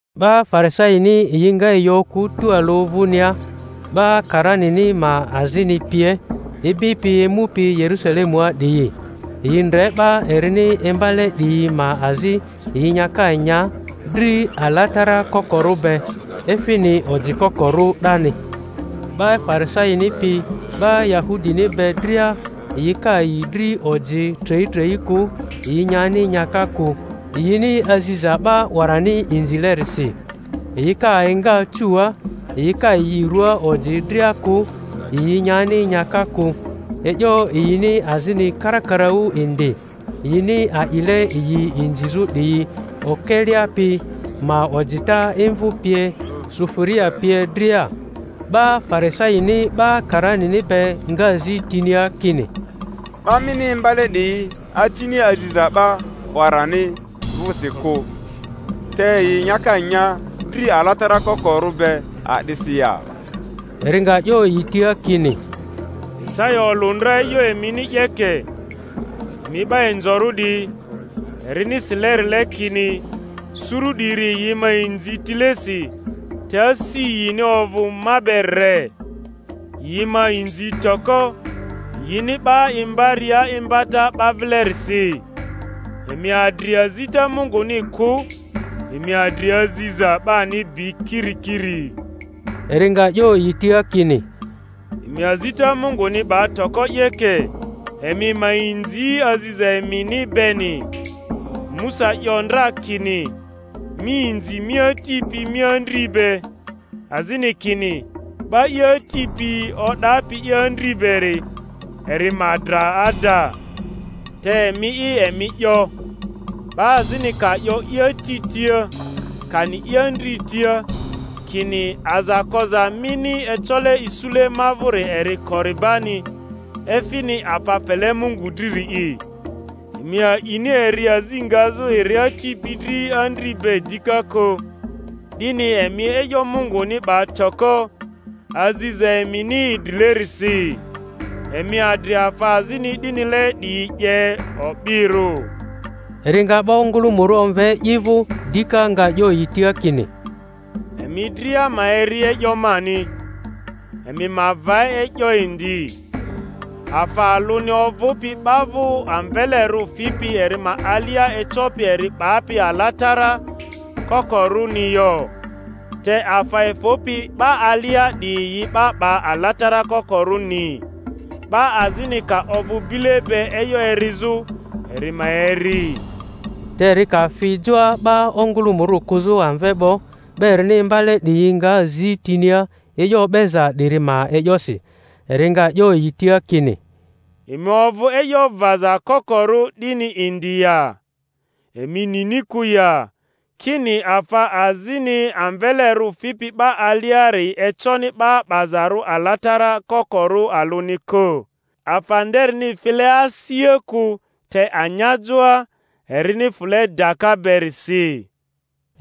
'Ba Farisaini yi nga yi okᴜ tualᴜ vᴜnia, 'ba karanini ma azini pie, ibipi emupi Yerusalemua 'diyi. Yi ndre 'ba erini imbale 'diyi ma azi yi nyaka nya dri alatara kokorᴜ be, efini ojikokorᴜ 'dani. ('Ba Farisaini piyi 'ba Yahudini be dria, yi ka yi dri oji treitrei kᴜ, yi nyani nyaka kᴜ, yini aziza 'ba 'warani inzilerisi; yi ka enga cuua, yi ka yi rua oji dria kᴜ, yi nyani nyaka kᴜ; e'yo yini azini karakaraᴜ indi, yini a'ile yi inzizᴜ 'diyi, okelea pi ma ojita imvᴜ pie, sufuria pie dria.) 'Ba Farisaini 'ba karanini be nga zi tinia kini, 'Ba mini imbale 'diyi acini aziza 'ba 'warani vᴜsi kᴜ, te yi nyaka nya dri alatara kokorᴜ be a'disi ya? Eri nga 'yo yi tia kini, Isaya olᴜ ndra e'yo emini 'yeke, emi 'ba inzorᴜ 'diyi, erini silerile kini, Suru 'diri, yi ma inzi tilesi, te asi yini ovᴜ ma be re; yi ma inzi toko, yini 'ba imbaria imbata 'ba vilerisi. Emi adri azita Munguni kᴜ, emi adri aziza 'bani bi kirikiri. Eri nga 'yo yi tia kini, Emi azita Munguni 'ba toko 'yeke, emi ma inzi aziza emini beni! Musa 'yo ndra kini, Mi inzi mi ati pi mi andri be; azini kini, 'Ba i ati pi o'dapi andri beri, eri ma dra ada; te emi'i emi 'yo, 'Ba azini ka 'yo i ati tia, kani i andri tia, kini, Aza koza mini ecole isule ma vᴜri eri Koribani (efini afa fele Mungu driri'i) emi a'ini eri azi ngazᴜ eri ati pi dri andri be dika kᴜ, 'dini emi e'yo Munguni 'ba toko, aziza emini idrilerisi. Emi adri afa azini 'dinile 'diyi 'ye o'birᴜ. Eri nga 'ba ongᴜlᴜmᴜrᴜ omve i vᴜ dika, nga 'yo yi tia kini, Emi dria ma eri e'yo mani, emi ma va e'yo indi: afa alᴜni ovᴜpi 'ba vᴜ amvelerᴜ fipi eri ma alia ecopi eri 'bapi alatara kokorᴜni yo; te afa efᴜpi 'ba alia 'diyi yi 'ba 'ba alatara kokorᴜni. 'Ba azini ka ovᴜ bile be e'yo erizᴜ, eri ma eri. Te eri ka fi joa 'ba ongᴜlᴜmᴜrᴜ kᴜzᴜ amve 'bo, 'ba erini imbale 'diyi nga zi tinia e'yo o'beza 'diri ma e'yosi. Eri nga 'yo yi tia kini, Emi ovᴜ e'yo vaza kokorᴜ 'dini indi ya? Emi nini kᴜ ya, kini afa azini amvelerᴜ fipi 'ba aliari econi 'ba 'bazarᴜ alatara kokorᴜ alᴜni kᴜ, afa nderini file asia kᴜ, te anyajoa, erini fᴜle daka berisi?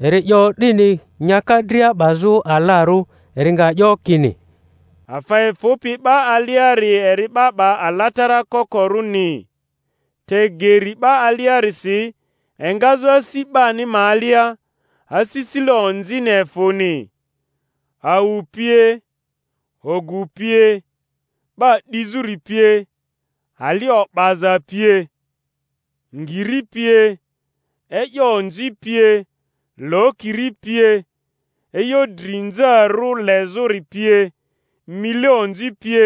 (Eri 'yo 'dini nyaka dria 'bazᴜ alarᴜ.) Eri nga 'yo kini, Afa efᴜpi 'ba aliari eri 'ba 'ba alatara kokorᴜni. Te geri 'ba aliarisi, engazᴜ asi 'bani ma alia, asisile onzini efᴜni, awu pie, ogu pie, 'ba 'dizᴜri pie, ali o'baza pie, ngiri pie, e'yo onzi pie, lokiri pie, e'yo drinzarᴜ lezᴜri pie, mile onzi pie,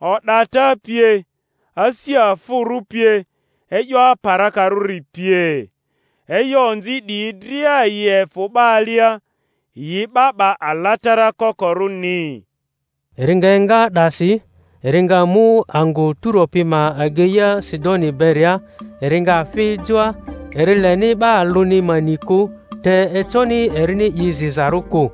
o'data pie, asi afᴜrᴜ pie, e'yo aparakarᴜri pie. E'yo onzi 'diyi dria yi efᴜ 'ba alia, yi 'ba 'ba alatara kokorᴜni. Eri nga enga 'dasi, eri nga mu angᴜ Turo pi ma ageia Sidoni beria. Eri nga fi joa, eri leni 'ba alᴜni ma ni kᴜ; te econi erini i zizarᴜ kᴜ.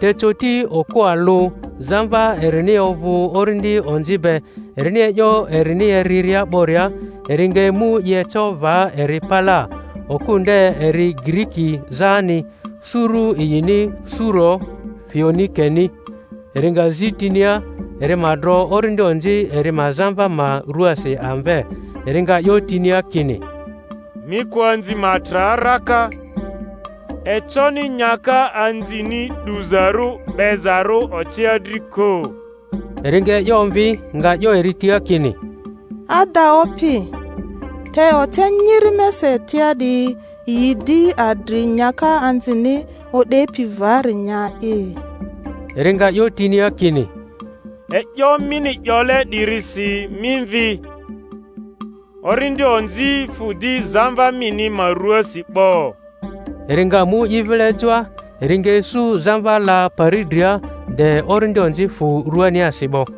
Te coti okᴜ alᴜ, zamva erini ovᴜ orindi onzi be, erini e'yo erini eriria 'boria, eri nga emu i eco va eri palaa. Okᴜ nde eri Giriki zani, suru yini Suro-Foenikeni. Eri nga zi tinia eri ma dro orindi onzi eri ma zamva ma ruaasi amve. Eri nga 'yo tinia kini, Mi kᴜ anzi ma tra raka, econi nyaka anzini 'duzarᴜ 'bezarᴜ ocea dri kᴜ. Eri nga e'yo omvi, nga 'yo eri tia kini, Ada Opi; te ocea nyiri mesa etia 'diyi yi di adri nyaka anzini o'depi vari nya'i. Eri nga 'yo tinia kini, E'yo mini 'yole 'dirisi mi mvi; orindi onzi fᴜ di zamva mini ma ruaasi 'bo. Eri nga mu i vile joa, eri nga isu zamva la pari dria, de orindi onzi fᴜ ruaniasi 'bo.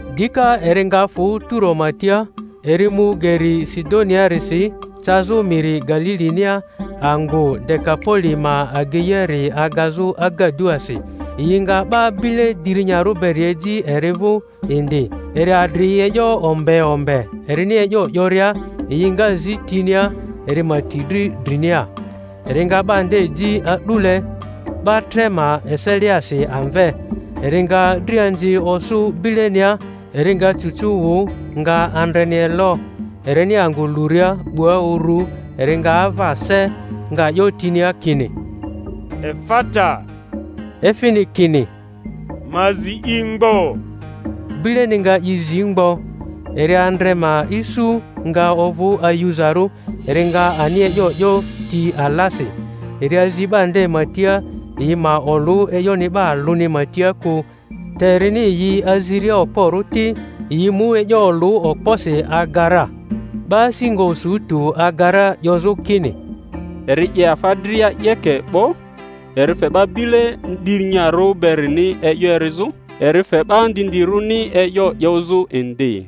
Dika eri nga fᴜ Turo ma tia, eri mu geri Sidoniarisi cazᴜ miri Galilinia, angᴜ Dekapoli ma ageiari agazᴜ agaduasi. Yi nga 'ba bile dirinyarᴜ beri eji eri vᴜ indi, eri adri e'yo ombe ombe erini e'yo 'yoria; yi nga zi tinia eri ma ti dri drinia. Eri nga 'ba nde ji a'dule 'ba tre ma eseliasi amve, eri nga drianzi osᴜ bilenia, eri nga cucu wᴜ, nga andreni elo; erini angᴜ luria 'bua uru eri nga ava se, nga 'yo tinia kini, Efata, efini kini, Ma zi i mgbo. Bileni nga i zi mgbo, eri andre ma isu nga ovᴜ ayuzarᴜ, eri nga ani e'yo 'yo ti alasi. Eri azi 'ba nde ma tia yi ma olᴜ e'yoni 'ba alᴜni ma tia kᴜ, te erini yi aziria okporᴜ ti, yi mu e'yo olᴜ okposi aga ra. 'Ba asi nga osu tᴜ aga ra, 'yozᴜ kini, Eri 'ye afa dria 'yeke 'bo; eri fe 'ba bile dirinyarᴜ berini e'yo erizᴜ, eri fe 'ba ndindirᴜni e'yo 'yozᴜ indi.